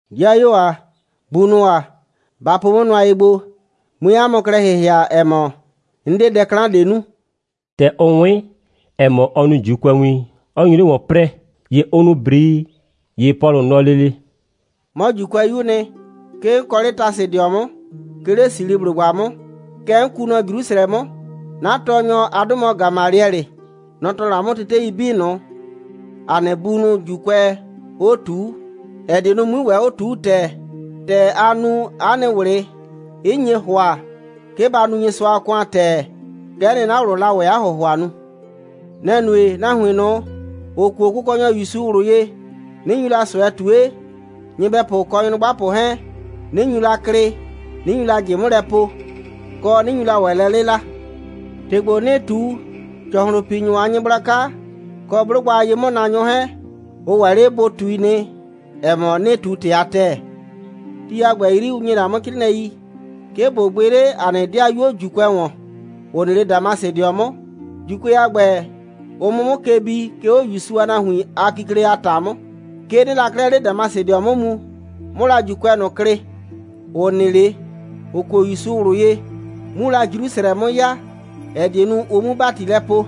«‑Dɩayuo ‑a, bunʋ ‑a, ba po 'mʋ nʋa ye gbo, 'mue 'a mʋ klɛ ‑hɩhɩa, ‑ɛ mɔ, 'n 'de dɛ 'klan ꞊de nu.» ‑Tɛ ʋ 'wɩn, ‑ɛ mɔ, ɔ nu ‑Juukʋɛwin, 'ɔ nyu 'le ‑wɔn 'prɛɛ, ‑ye ʋ nu ‑brii. ‑Ye Pɔlʋ nɔ lele: «'Mɔ ‑Juukʋɛyu'u nɩ. 'Ke 'n kɔ 'le Tasɩdɩɔ 'mʋ, 'ke 'le Silisiblʋgba 'mʋ. Kɛɛ, kɛ 'n kuu nɔ Jrusrɛ 'mʋ. 'Na tɔɔnyɔ, 'a 'dʋ mɔ Gamaliɛlɩ. Nɔ‑ tɔɔ la 'mʋ tetei 'bii ꞊nʋ, ‑a nɩ bunʋ ‑Juukʋɛɛ 'o ꞊tuu, ‑ɛ die nu, 'mui ‑wɛ 'o ꞊tuu ‑tɛɛ. ‑Tɛ aa nu, 'a nɩ ꞊wlɩ 'ɩ nye ‑hʋa, 'ke ba nu Nyɩsʋa a ‑kʋan ‑tɛɛ, kɛ'ɛ nɩ, 'na ꞊wlʋʋ la 'a ‑hʋhʋa nu. Nɛ‑ nue, nahuin ꞊nʋ, ‑ʋ kuo Kʋkɔnyɔ ‑Yusu ꞊wlʋ ye, 'nɩ nyu la ꞊sʋɛ ꞊tue, nyɩbɛpʋ kɔ nyrʋgbapʋ 'hɛɛn, 'nɩ nyu la klɩ, 'nɩ nyu la ꞊jɩ 'mʋ lɛ po, kɔ, 'nɩ nyu la ‑wɛ lɛ 'lɩla. ‑Tɩ ‑gbo, 'nɩɩ ꞊tu, ‑cɔhlʋnpinyʋ a nyɩgblaka, kɔ 'blʋgba a ye'mʋnaanyʋ 'hɛɛn, ʋ ‑wɛ 'le bʋ ꞊tui nɩ, ‑ɛ mɔ, 'nɩɩ ꞊tu ‑tɩ a ‑tɛɛ. Ti a ‑gbɛ 'yri, ʋ ‑nyi la 'mʋ 'crɩɩnɩɛi, 'ke ꞊bo gbɩ 'le ‑a nɩ 'dɩayuo ‑Juukʋɛ ‑wɔn, ‑ʋ nɩ 'le Damasɩdɩɔ 'mʋ, ‑Juukʋɛ a ‑gbɛ, ʋ 'mʋ 'mʋ ke bi, 'ke 'o ‑Yusu a nahuin a kikle a ‑ta 'mʋ. 'Ke 'nɩɩ la 'klɛɛ 'le Damasɩ 'mʋ mu, 'mʋ la ‑Juukʋɛ ꞊nʋ klɩ, ‑ʋ nɩ 'le, ‑ʋ kuo ‑Yusu ꞊wlʋ ye, 'mu la Jrusrɛ 'mʋ ya, ‑ɛ die nu, ʋ 'mu ‑bati lɛ poo.»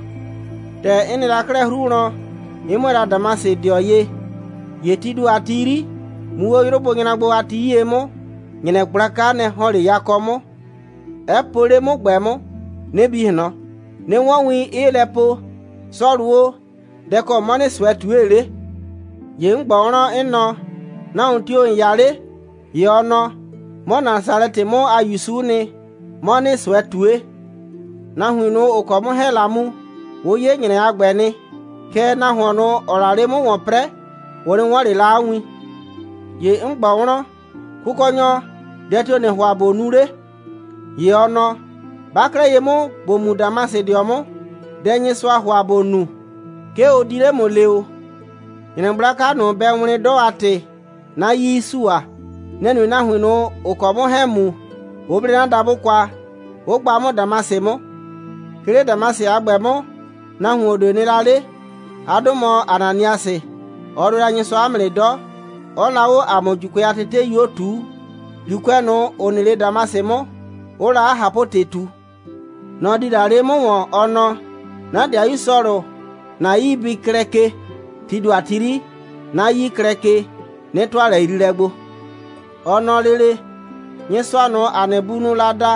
«‑Tɛ 'n nɩ la 'klɛɛ 'hru wlɔn, 'n 'mʋɛɛ la Damasɩdɩɔ ye, ‑ye tii ‑do a ti 'yri, muu 'o 'yrʋ bʋ nyra gbo a ti 'yie 'mʋ, ‑nyrɛ gblaka, nɛ‑ ‑hɔn 'le yakɔ 'mʋ, 'ɛ po 'le 'mʋ ꞊gbɛ 'mʋ, 'nɩ bi ꞊hlɔn, 'nɩ 'wɔn win, 'ɩɩ lɛ po: Sɔlʋ o, dɛ‑ kɔ 'mɔ ‑nɩɩ ꞊sʋɛ ꞊tue 'le? ‑Ye 'n ꞊gbɔ wlɔn, 'n nɔ: Nahuon tio‑ ‑n 'ya 'le? ‑Ye ɔ nɔ: 'Mɔ Nasalɛtɩ 'mʋ a ‑Yusu'u nɩ, 'mɔ ‑nɩɩ ꞊sʋɛ ꞊tue. Nahuin, ‑ʋ kɔ 'mʋ 'hɛɛn‑ la mu, ʋ 'ye ‑nyrɛ a ‑gbɛ nɩ, kɛɛ, nahuon ꞊nʋ, ‑ɔɔ la 'le 'mʋ ‑wɔn 'prɛɛ, ʋ 'nɩ 'wɔn ꞊le la 'a win. ‑Ye 'n ꞊gbɔ wlɔn: Kʋkɔnyɔ, dɛ tio‑ ‑nɩɩ ‑hʋa ꞊bo nu 'le? ‑Ye ɔ nɔ: 'Ba 'klɛɛ ye 'mʋ, ‑bo mu Damasɩdɩɔ 'mʋ. Dɛ Nyɩsʋaa ‑hʋa ‑bo nu, 'ke ʋ di 'le ‑mʋ le ‑o. ‑Nyrɛ gblaka ꞊nʋ, bɛ wlɩn 'dɔ a ‑tɩ, 'na 'yii 'ɩ sua. Nɛ‑ nue, nahuin ꞊nʋ, ‑ʋ kɔ 'mʋ 'hɛɛn‑ mu, 'ʋ 'ble 'na dabʋ kwa, 'ʋ gba 'mʋ Damasɩ 'mʋ. 'Ke 'le Damasɩ a ‑gbɛ 'mʋ, nahuon ꞊de nɩ la 'le. 'A 'dʋ mɔ Ananiasɩ. Ɔ nʋɛ la Nyɩsʋa 'mʋ nɩ 'dɔ, 'ɔɔ la 'o ‑a mʋ ‑Juukʋɛ a tetei 'bii 'o ꞊tuu, ‑Juukʋɛ ꞊nʋ, ‑ʋ nɩ 'le Damasɩ 'mʋ, 'ʋʋ la 'a ꞊hapʋ‑tɩ ꞊tu. Nɔ‑ di la 'le 'mʋ ‑wɔn, ɔ nɔ: 'Na ‑dɩayu Sɔlʋ, ‑na 'yii bɩ klɛ ke! Tii ‑do a ti 'yri, 'na 'yii 'ɩ klɛ ke, 'nɩ ‑tʋa lɛyriilɛ gbo. Ɔ nɔ lele: Nyɩsʋa ꞊nʋ, ‑a nɩ bunʋʋ la da,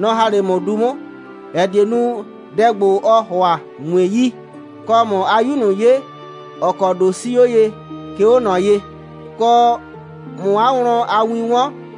nɔ‑ ‑ha la 'le ‑mʋ du 'mʋ, ‑ɛ die nu, dɛ ‑gbo, ɔɔ ‑hʋa, ꞊mue yi, kɔ, ꞊mʋ 'a 'Yu ꞊nʋ 'ye, ‑ɔ kɔ ‑do 'sii 'o ye, 'ke 'o ꞊nɔ ye, kɔ, ꞊mʋ 'a wlɔn a win 'wɔn,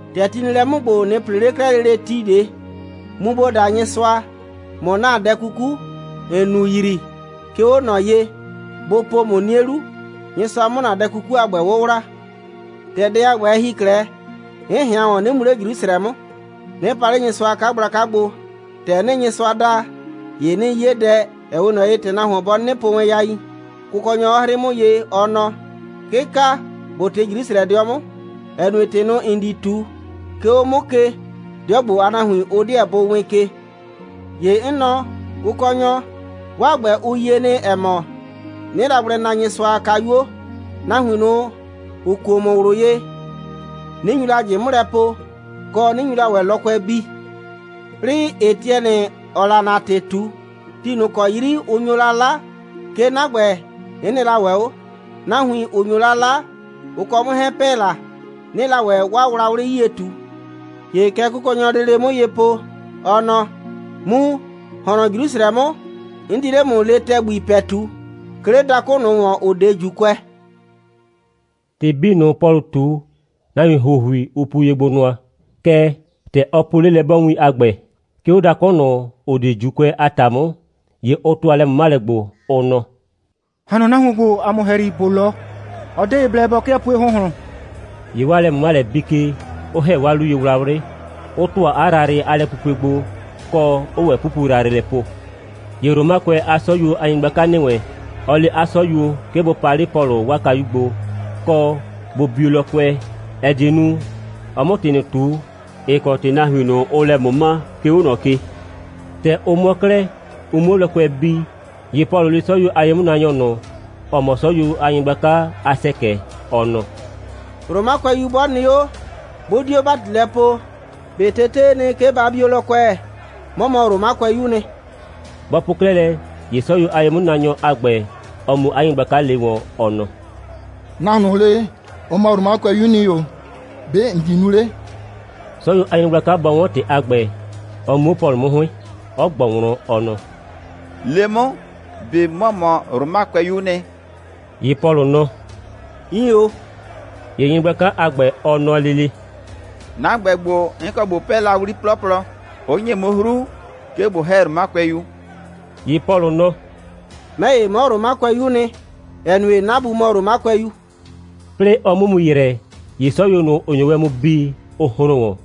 ‑Tɛ ti nɩ lɛ 'mʋ ‑gbo, ꞊nɩ ‑pre 'le 'klɛɛ lele ti ꞊de, mu, ‑bo da Nyɩsʋa, ꞊mʋ ‑na dɛ 'kuku, ‑n nu yrii, 'ke 'o ꞊nɔ ye, bʋ po ‑mʋ 'nie 'lu, Nyɩsʋa 'mʋ ‑na dɛ 'kuku a ‑gbɛ 'wʋwla.» «‑Tɛ dɛ a ‑gbɛ, ɛ ‑hi 'klɛɛ, 'n ꞊hɩan ‑wɔn, 'nɩ mu 'le Jrusrɛ 'mʋ, 'nɩ pa 'le Nyɩsʋa a 'kagblaka gbo. ‑Tɛ 'nɩɩ Nyɩsʋa da, ‑ye 'nɩɩ 'ye dɛ, ‑ɛ 'we ꞊nɔ ye, ‑tɛ nahuon bɔ 'nɩnɩ po yain, Kʋkɔnyɔ 'ɔ 'hrɩɩ 'mʋ ye, ɔ nɔ: 'Kɩka, ‑bo ꞊tɩ Jrusrɛdɩɔ 'mʋ, ‑ɛ nue, ‑tɩ ꞊nʋ, ‑n di ꞊tu, 'ke 'o 'mʋ ke, 'dɩɔ ‑gbo a nahuin, ʋ 'deɛ bʋ wɩɩn ke. ‑Ye 'n nɔ: Kʋkɔnyɔ, 'waa ‑gbɛ, ʋ yie nɩ, ‑ɛ mɔ, 'nɩɩ la gblɛ na Nyɩsʋa a kayuo, nahuin ꞊nʋ, ‑ʋ kuo ‑mʋ ꞊wlʋ ye, 'nɩ nyu la ꞊jɩ 'mʋ lɛ po, kɔ, 'nɩ nyu la ‑wɛ lɔkʋɛ bii. 'Plɩɩ, Etiɛnɩ, ‑ɔɔ la ‑na ‑tɩ ꞊tu, ti ꞊nʋ ‑kɔ 'yri ʋ nyo la 'la, 'ke 'na ‑gbɛ, 'n nɩ la ‑wɛ 'o. Nahuin, ‑ʋ nyo la 'la, ʋ kɔ 'mʋ 'hɛɛn‑ pɛ la, 'nɩɩ la ‑wɛ 'waa wlawlɩ 'yie ꞊tu. ‑Ye kɛ Kʋkɔnyɔɔ la lele 'mʋ ye po, ɔ nɔ: Mu, ‑hɔn nɔ Jrusrɛ 'mʋ, 'n di 'le ‑mʋ lee ‑tɛgbi ‑pɛtu, 'ke 'le dakʋ ꞊nʋ ‑wɔn, ‑ʋ 'de ‑Juukʋɛ.» ‑Tɩ 'bii ꞊nʋ, Pɔlʋ ꞊tu, nahuin ‑huohui, ʋ puo ye gbo nʋa. Kɛɛ, ‑tɛ ɔ po 'lelɛ'bɔɔwin a ‑gbɛ, 'ke 'o dakʋ ꞊nʋ, ‑ʋ 'de ‑Juukʋɛ a ‑ta 'mʋ, ‑ye ʋ ‑tʋa lɛ꞊mʋmalɛ gbo, ʋ nɔ: «‑Ha nɔ nahuon ‑gbo ‑a mʋ ‑hɛyri, ‑bo 'lɔ. Ɔ 'de ye blɛ bɔ 'kɩɛ pue ‑hʋnhlʋn!» ‑Ye 'waa lɛ꞊mʋmalɛ bii ke, 'ʋ ‑hɛ 'waa 'luyewlawlɩ, 'ʋ ‑tʋa 'a yrayrɩ a lɛpupue gbo, kɔ, 'ʋʋ ‑wɛ 'pupu yrayrɩ lɛ po. ‑Ye Romakʋɛ a 'sɔyuo a nyɩgblaka ‑nɩ wɛn, ɔ le 'a 'sɔyuo, 'ke bʋ paa 'le Pɔlʋ 'waa kayu gbo, kɔ, bʋ bio lɔkʋɛ, ‑ɛ die nu, ɔ 'mʋ ‑tɩ ꞊nʋ ꞊tu, ‑ɩ kɔ ‑tɩ nahuin ꞊nʋ, ʋʋ lɛ ꞊mʋma, 'ke 'o ꞊nɔ ke. ‑Tɛ ʋ mʋɔ 'klɛɛ, ʋ 'muo lɔkʋɛ bii, ‑ye Pɔlʋ le 'sɔyuo a ye'mʋnaanyɔ ꞊nʋ, ‑ɔ mɔ 'sɔyuo a nyɩgblaka a ‑sɛkɛ, ɔ nɔ: «Romakʋɛyu 'bɔ nɩ 'o, 'bʋ 'dio ‑bati lɛ poo, ꞊be tetee nɩ, 'ke ba bio lɔkʋɛ? 'Mɔ mɔ Romakʋɛyu'u nɩ.» Bɔ po 'klɛɛ lɛ, ‑ye 'sɔyuo a ye'mʋnaanyɔ a ‑gbɛ, ɔ mu 'a nyɩgblaka le wɔn, ɔ nɔ: «Nahuon ꞊nʋ le, ɔ mɔ Romakʋɛyu'u nɩ ‑o. ‑Be' ‑n di nu 'le?» 'Sɔyuo a nyɩgblaka bɔ 'wɔn ‑tɩ a ‑gbɛ, ɔ mu 'o Pɔlʋ 'mʋ 'hʋɩn, 'ɔ ꞊gbɔ wlɔn, ɔ nɔ: «Le 'mʋ, ꞊be ‑mɔ mɔ Romakʋɛyu'u nɩ?» ‑Ye Pɔlʋ nɔ: «Iin ‑o.» ‑Ye nyɩgblaka a ‑gbɛ, ɔ nɔ lele: «'Na ‑gbɛ ‑gbo, 'n kɔ ꞊bo 'pɛɛ la 'wli 'plɔplɔ, 'ʋ ‑nye 'mʋ 'hru, 'ke ꞊bo ‑hɛ Romakʋɛyu.» ‑Ye Pɔlʋ nɔ: «'Mɛ ‑ye, 'mɔ Romakʋɛyu'u nɩ, ‑ɛ nue, 'na bu mɔ Romakʋɛyu.» 'Plɩɩ ɔ 'mʋ mu ‑yrɛ, ‑ye 'sɔyuo ꞊nʋ, ‑ʋ nyo wɛn mu bi, ʋ hron ‑wɔn.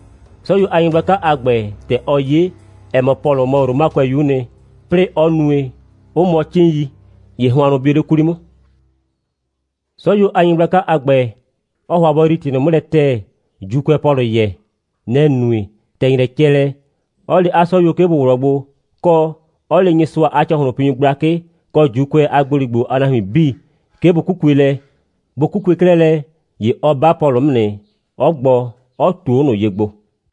'Sɔyuo a nyɩgblaka a ‑gbɛ, ‑tɛ ɔ 'ye, ‑ɛ mɔ, Pɔlʋ mɔ Romakʋɛyu'u nɩ, 'plɩɩ 'ɔ nue, 'ʋ mʋɔ 'cɩɩn.i, ‑ye hʋannʋ bio 'le 'kwli 'mʋ. 'Sɔyuo a nyɩgblaka a ‑gbɛ, ɔɔ ‑hʋa bɔ yrii ‑tɩ ꞊nʋ 'mʋ lɛ ‑tɛɛ, ‑Juukʋɛɛ Pɔlʋ yɛɛ. Nɛ‑ nue, ‑tɛ ‑nyrɛ cɛ lɛ, 'ɔ le 'a 'sɔyuo, 'ke bʋ ꞊wlɔɔ gbo, kɔ, 'ɔ le Nyɩsʋa a ‑cɔhlʋnpinyʋ gblakɩ, kɔ ‑Juukʋɛ a ‑gboligbo a nahuin 'bii, 'ke bʋ 'kukue lɛ. Bʋ 'kukue 'klɛɛ lɛ, ‑ye ɔ 'ba Pɔlʋ 'mʋ nɩ, 'ɔ gbɔ, 'ɔ ꞊tuo 'o ꞊nʋ ye gbo.